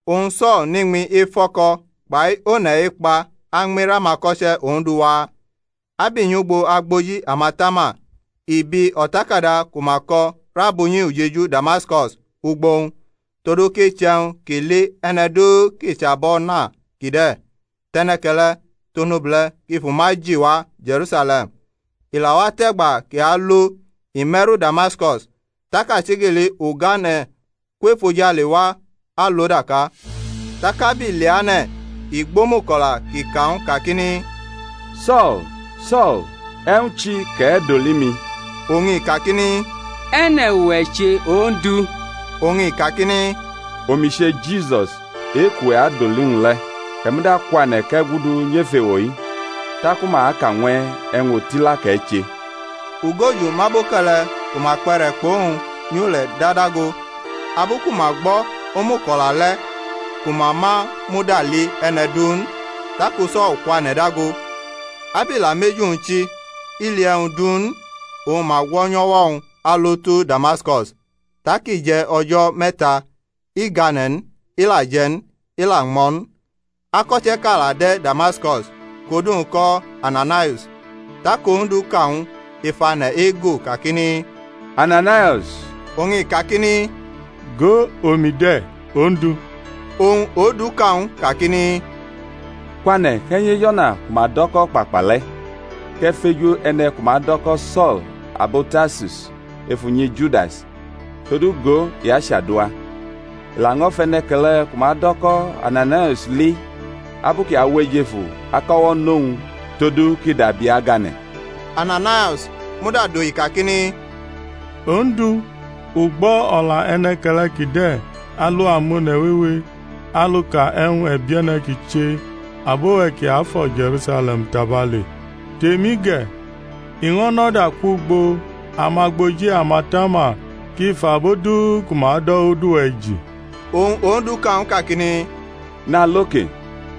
Oñ So̩l nʼiñmi ef o̩ko̩ kpai one̩ ekpa añmi rʼamako̩che̩ Ondu waa, ab i nyʼugbo agboji amatama i biʼi o̩takada ku ma ko̩ rʼab unyi ujeju Damaskus ugbo-wñ, todu kʼiche̩wñ kʼi li e̩ne̩ du kʼi chʼabʼO̩na kide̩, tʼe̩ne̩ke̩le̩ tʼonobule̩ kʼi fʼuma ji wa Je̩rusale̩m. I la watʼe̩gba kʼi alo i me̩ru Damaskus, tak achigili ugane̩ kwo ef ojale wa alʼo daka. Tak ab i leane̩ i gbʼomuko̩la kʼi ka ñw u kakini, So̩l, So̩l, e̩wñ chi kʼe̩ doli mi? Oñ i kakini, E̩ne̩ uwe̩ che, Ondu? Oñ i kakini, Omi che Jisus e-kʼuwe̩ adoli ñw u le̩. E̩ muda kwane̩ kʼe̩ gudu nyef ewo-i, taku ma aka ñw e̩ e̩wñ otila kʼe̩ che. Ugoju mʼaboke̩le̩ ku ma kpe̩re̩ kpʼowñ nyule̩ da dago abu ku ma gbo̩ omuko̩la le̩ ku ma ma muda li e̩ne̩ du n. Taku So̩l kwane̩ dago. Ab i la mʼeju-wñ chi i li e̩wñ du n. Oñ ma gwo̩nyʼo̩wo̩-wñ alo tu Damaskus. Tak i je̩ o̩jo̩ me̩ta, i gane̩ n, i la je̩ n, i la ñmo̩ n. Ako̩che̩ʼka la de̩ Damaskus kʼodu-wñ ko̩ Ananaius. Tak Ondu ka ñw u ef ane̩ ego kakini, Ananaius. Oñ i kakini, Go, omi de̩, Ondu. Oñ Ondu ka ñw u kakini, Kwane̩, kʼe̩ nyʼej o̩na ku ma do̩ kʼO̩kpakpa le̩, kʼe̩ feju e̩ne̩ ku ma do̩ ko̩ So̩l abo Tarsus ef unyi Judas: todu, go, i achadua. I laño̩ fʼe̩ne̩ke̩le ku ma do̩ ko̩ Ananaius li abu kʼi awʼejefu akʼo̩wo̩ nʼowñ todu kʼi dabi agane̩. Ananaius muda dohi kakini, Ondu, u gbo̩ o̩la e̩ne̩ke̩le̩ kide̩ alu amone̩ wewe aluka e̩wñ e̩bie̩ne̩ kʼi che abo-we̩ kiafo̩ Je̩rusale̩m tabale; tʼemi ge̩, i ño̩ nʼo̩da kwugbo amagboji amatama kʼi fʼabo du ku ma do̩ odu-we̩ ji. Oñ Ondu ka ñw u kakini, Nalo ke,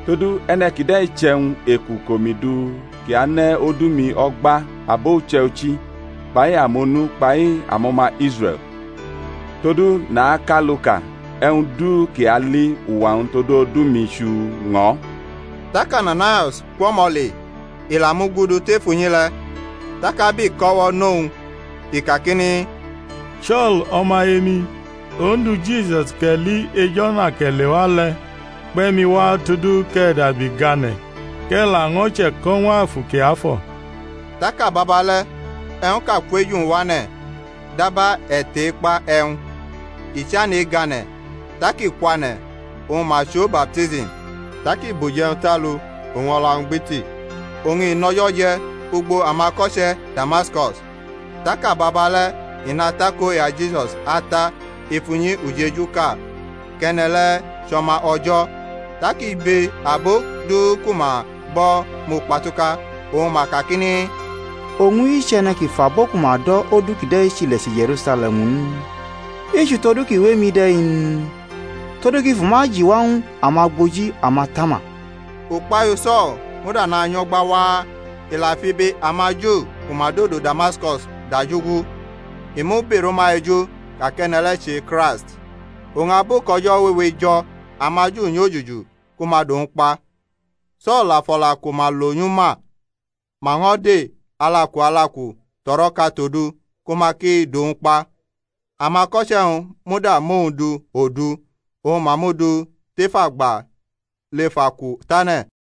todu e̩ne̩ kide̩ chʼe̩wñ eku kʼomi du kʼi ane̩ odu-mi o̩gba abo uche̩ichi kpai amonu kpai amo̩ma Israe̩l; todu nakʼaluka e̩wñ du kʼi ali uwa-wñ tod odu-mi chuu ñʼo̩. Tak Ananaius kwʼo̩mo̩ le, i la mugudu tef unyi le̩; tak ab i kʼo̩wo̩ nʼowñ i kakini, So̩l, o̩maye-mi, Ondu, Jisus kʼe̩ li ej o̩na kʼe̩ lewa le̩, kpe̩ mi wa todu kʼe̩ dabi gane̩ kʼe̩ laño̩ che̩ko̩ ñw Afu Kiafo̩. Tak ababa le̩ e̩wñʼka kwʼeju-wñ wane̩ daba e̩tei-kpa e̩wñ, i chane̩ egane̩, tak i kwane̩ oñ ma chʼo baptism. Tak i bʼuje̩wñ tʼalu oñ o̩la-wñ gbiti. Oñ i nʼo̩jo̩ je̩ ugbo amako̩che̩ Damaskus. Tak ababale̩ i nʼakoya Jisus ata ef unyi ujeju ka kʼe̩ne̩ le̩ chʼO̩ma O̩jo̩. Tak ibe abo du ku ma gbo̩ mukpatuka, oñ ma kakini, Owñ-i chʼe̩ne̩ ki fʼabo ku ma do̩ odu kide̩ chile̩che̩ Je̩rusale̩m n? i chʼutodu ki wʼemi de̩ n? todu kʼi fʼuma ji wa ñw amagboji amatama. Ukpahiu So̩l muda nanyo̩gba waa, i la fʼibe amaJu ku ma dodo Damaskus dajugu, i mu-birʼuma eju ka kʼe̩ne̩ le̩ che Kraist. Oñ abu kʼo̩jo̩ wewe jo̩ amaJu nyojuju ku ma dʼowñ kpa. So̩l la fʼo̩la ku ma lo nyʼu ma. Ma ño̩ de alaku alaku tʼo̩ro̩ka tʼodu kʼama ki dʼowñ kpa. Amako̩che-wñ muda mʼowñ du odu, oñ ma mʼu du tʼef agba lʼef aku tane̩.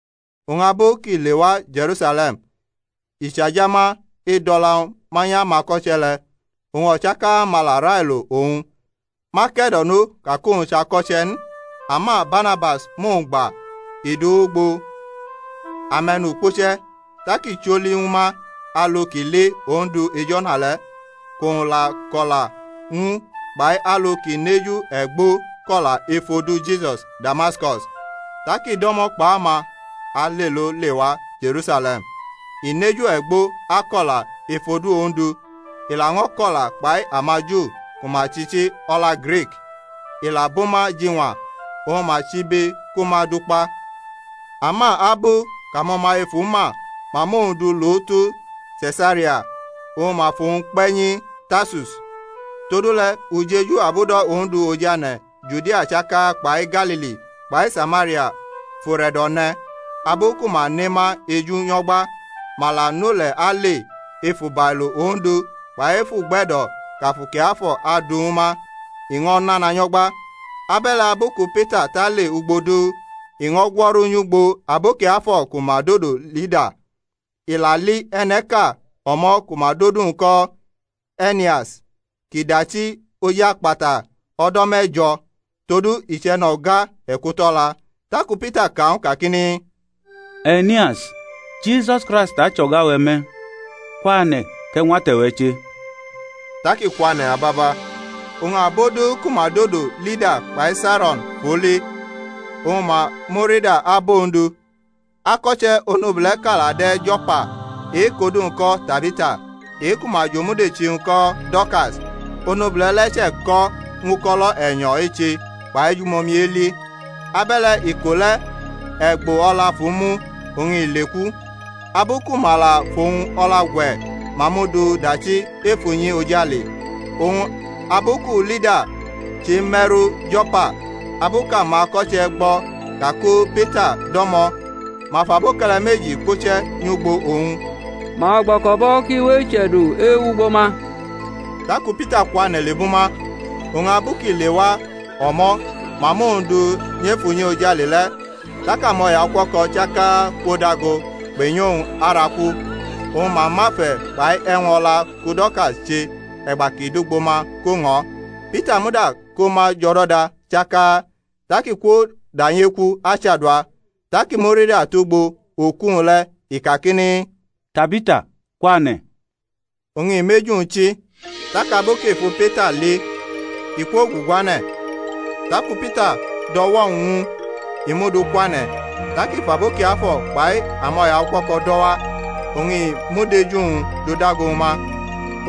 Oñ abu kʼi lewa Je̩rusale̩m i chajama e̩dʼo̩la-wñ manyʼamako̩che̩ le̩. O̩chaka-ma la railo owñ, ma ke̩do̩no ka kʼowñ chʼako̩che̩ n. Ama Barnabas mʼowñ gba, i dʼu wʼugbo ame̩nukpuche̩, tak i choli ñwu ma alu kʼi li Ondu ej o̩na le̩, kʼowñ la ko̩la ñw u, kpai alu kʼi nʼeju e̩gbo ko̩la ef odu Jisus, Damaskus. Tak i do̩mo̩ kpʼama alelo lewa Je̩rusale̩m, i nʼeju e̩gbo ako̩la ef odu Ondu. I laño̩ ko̩la kpai amaJu ku ma chʼichi o̩la Grik, i la bʼuma jiñwa; oñ ma chʼibe ku ma dʼu kpa. Ama abu kʼamo̩maye fu ma, ma mʼowñ du lo tu Se̩saria, oñ ma fʼowñ kpe̩ nyi Tarsus. Todule̩ ujeju abudo̩ Ondu ojane̩ Judia chaka kpai Galili kpai Samaria fʼure̩do̩ ne̩, abu ku ma ne ma eju nyo̩gbe̩; ma la nʼule̩ ale ef ubailo Ondu kpai ef ugbe̩do̩ kʼAfu Kiafo̩ adu ñwu ma, i ño̩ nana nyo̩gba. Abe̩le̩ abu ku Pita tʼale ugbo du, i ño̩ gwo̩ru nyʼugbo abo kiafo̩ ku ma dodo Lida. I la li e̩ne̩ʼka o̩mo̩ ku ma dʼodu-wñ ko̩ E̩nias, kʼi dachi oj akpata o̩do̩ me̩jo̩, todu i chʼe̩no̩ga e̩kuto̩la. Taku Pita ka ñw u kakini, E̩nias, Jisus Kraist achʼo̩ga-we̩ me̩, kwane̩, kʼe̩ ñwʼate̩-we̩ che. Tak i kwane̩ ababa. Oñ abo du ku ma dodo Lida kpai Saro̩n fʼu li, oñ ma murida abʼOndu. Ako̩che̩ onobule̩ʼka la de̩ Jo̩pa, e-kʼodu-wñ ko̩ Tabita, e-ku ma jʼomudechi-wñ ko̩ Do̩rkas, onobule̩ le̩ che̩ko̩ ñw uko̩lo̩ e̩nyo̩ eche kpai ejumomi eli. Abe̩le̩ iko le̩ e̩gbo o̩la fʼu mu, oñ i leku; abu ku ma la fʼowñ o̩la gwe̩ ma mʼu du dachi ef unyi ojale. Oñ abu ku Lida cheme̩ru Jo̩pa, abu kʼamako̩che̩ gbo̩ ka ku Pita dʼo̩mo̩ ma fʼaboke̩le̩ meji kpuche̩ nyʼugbo owñ, ma gbo̩ko̩bʼo̩ kʼi we eche̩du ewugbo ma. Taku Pita kwane̩ lebʼuma. Oñ abu kʼi lewa o̩mo̩ ma mʼowñ du nyʼef unyi ojale le̩, tak amo̩yaukuo̩ko̩ chaka kwo dago kpe̩nyʼowñ araku, oñ ma mʼafe̩ kpai e̩wñ o̩la ku Do̩rkas che e̩gba kʼi dʼugbo ma ko ñʼo̩. Pita muda ko ma jʼo̩do̩da chaka, tak i kwodanyeku achadua. Tak i murida tugbo oku-wñ le̩, i kakini, Tabita, kwane̩. Oñ i mʼeju-wñ chi, tak abu kʼi fu Pita li i kwoguguane̩. Taku Pita dʼo̩wo̩-wñ ñw u, i mʼu du kwane̩, tak i fʼabo kiafo̩ kpai amo̩yaukuo̩ko̩ do̩ wa, oñ i mʼudeju-wñ dudago ñwu ma.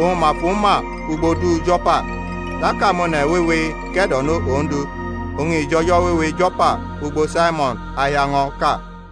Oñ ma fʼu ma ugbo du Jo̩pa, tak amone̩ wewe ke̩do̩no Ondu. Oñ i jʼo̩jo̩ wewe Jo̩pa ugbo Saimo̩n ahiaño̩ ʼka.